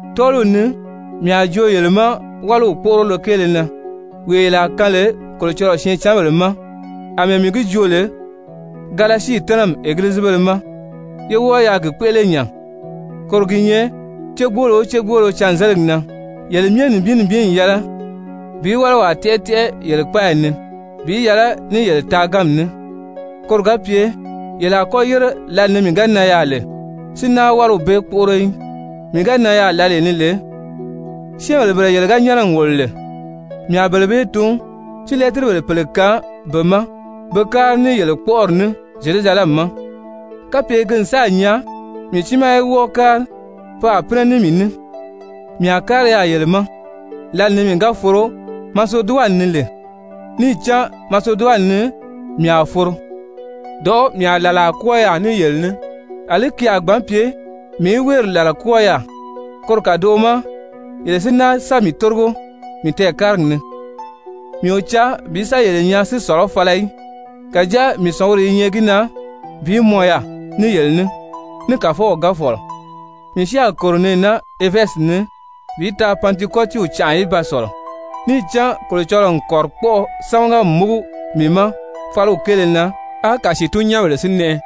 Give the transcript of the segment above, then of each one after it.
Tɔ́ɔliw ni mii a joo yele ma wáliw kpóʔorolo kéele na, wee yele a kaan lè Kolocɔlɔɔ syɛɛncanbèle ma, àmɛɛ mii gi joo lè Galasii tɛ́nɛmi egilizibéle ma, ye wɔ́ɔ yaa gi kpéʔele nya. Koro gi nyɛ cégboolo o cégboolo cânzeligi na, yele myɛ nibin nibin n yɛlɛ bi wáliwaa tɛ́ʔɛ tɛ́ʔɛ yele kpáayi ni bi yɛlɛ ní yele taaganmi ní, koro ga pye yele a kɔ́ yére lǎli ni mii ga nan yaà lè si náa wáliw bee kpóʔoro í. Mii ga nan yaà lǎlee ni lè, syɛ́ɛnbèle bele yele ga nyɛ́nɛ n wòlo lè, mii a bele bee tun, si lɛ́tiribèle pèle kaan be ma be kári ní yele kpɔ́ʔɔri ní Zyerusalɛmi ma. Kapye ki n sáà nyaa mii tiimaa í wɔ́ɔ kári, pe a pínɛ ní mii ní. Mii a kári yaà yele ma lǎli ni mii ga foro Maseduwani ni lè, níì cán Maseduwani ni mii a foro. Dɔ̀ʔɔ́ mii a làlaa kwɔ́ɔ yaà ní yele ní, àlí ki a gbǎn pye mii í wéeri làla kwɔ́ɔ yaà, koro kàdoʔo ma yele si náa sa mii tórigo mii tɛɛkárigi ni. Mii o caa bi sa yele nyaa si sɔ̀lɔ́ fala í, kàjáa mii sɔ̀nguri i nyɛ gi na bi mɔn yaà ní yele ní, ní Kàfɔw ga fɔ̀lɔ. Mii si a kòro nɛɛ naa Efɛzi ni bi taa Pantikɔtiw canʔa í ba sɔ̀lɔ. Níì cán Kolocɔlɔɔ n kɔ̀rikpɔʔɔ sámaga n múgu mii ma fáliw kéele na, á kàsiitun-nyɛ́nbèle si nɛʔɛ.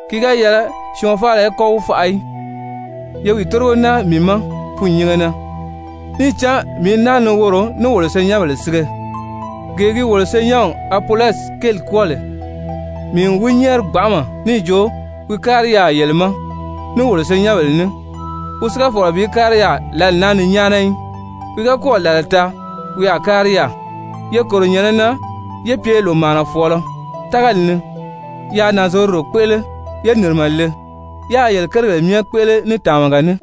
Ki ga yɛlɛ syɔɔn faala í kɔ́ wi faʔa í. Ye wi tórigo náa mii ma fûnnyinge na, níì cán mii i naa ni woro, ní wolo senyɛnbèle sige. Gee gi wolo senyɛnw Apolɔsi kéeli kwɔ́ɔ lè, mii n wi nyɛ́ɛri gbanʔama níì jo wi kári yaà yele ma ní wolo senyɛnbèle ní, wi si ga fɔ̀lɔ bi kári yaà lǎli naa ni nyáana í. Wi ga kɔ́ɔ̀ làlaa taa wi a kári yaà. Ye kòro nyɛ̀nɛ na, yé pye lòmaanafɔɔlɔ tágali ni, yáā nànzorodo kpéʔele, yé nìrimɛ le, yáā yele kérigèle myɛ kpéʔele ní tàmaga ní.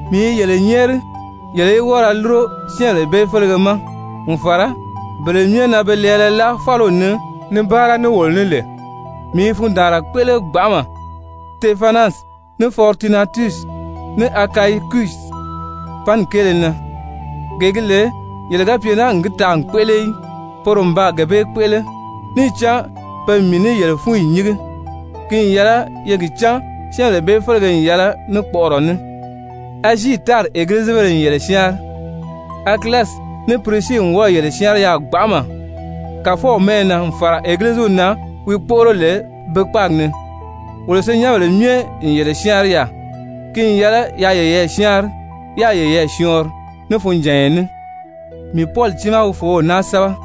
Mii i yele nyɛ́ɛri yele í wɔ́ɔ ra lúro syɛ́ɛnbèle bee félege ma n fàra bele myɛ na be lɛɛlɛ láa fáliw ni ni báara ní wolo ní lè. Mii i fundaanra kpéʔele gbanʔama Sitefanasi, ní Fɔritunatusi, ní Akayikusi panni kéele na. Gee gi lè yele ga pye naa n gi taa n kpéʔele í, poro n baa gee bee kpéʔele. Níì cán pe n mii ní yele fúnyi nyíngi. Ki n yɛlɛ ye gi cán syɛ́ɛnbèle bee félege n yɛlɛ ní kpɔʔɔrɔ ní. Azii tári Egilizibéle n yele syáanri. Akilasi ní Pirisii n wɔ́ɔ̀ yele syáanri yaà gbanʔama Kàfɔw mɛ́ʔɛ na n fàra Egiliziw na wi kpóʔoro lè be kpáagi ni. Wolo senyɛnbèle myɛ n yele syáanri yaà. Ki n yɛlɛ yaa yeyɛɛ syáanri, yáā yeyɛɛ syɔɔnri ní funjànya ní. Mii Pɔli tiimaa wi fòów naa sɛ́bɛ.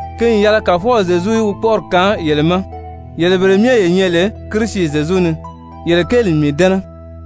Ki n yɛlɛ Kàfɔw Zyezu í wi kpɔ́ʔɔri kaan yele ma! Yele bele myɛ ye nyɛ lè Kirisi Zyezu ni, yele kéeli n mii dɛ́nɛ.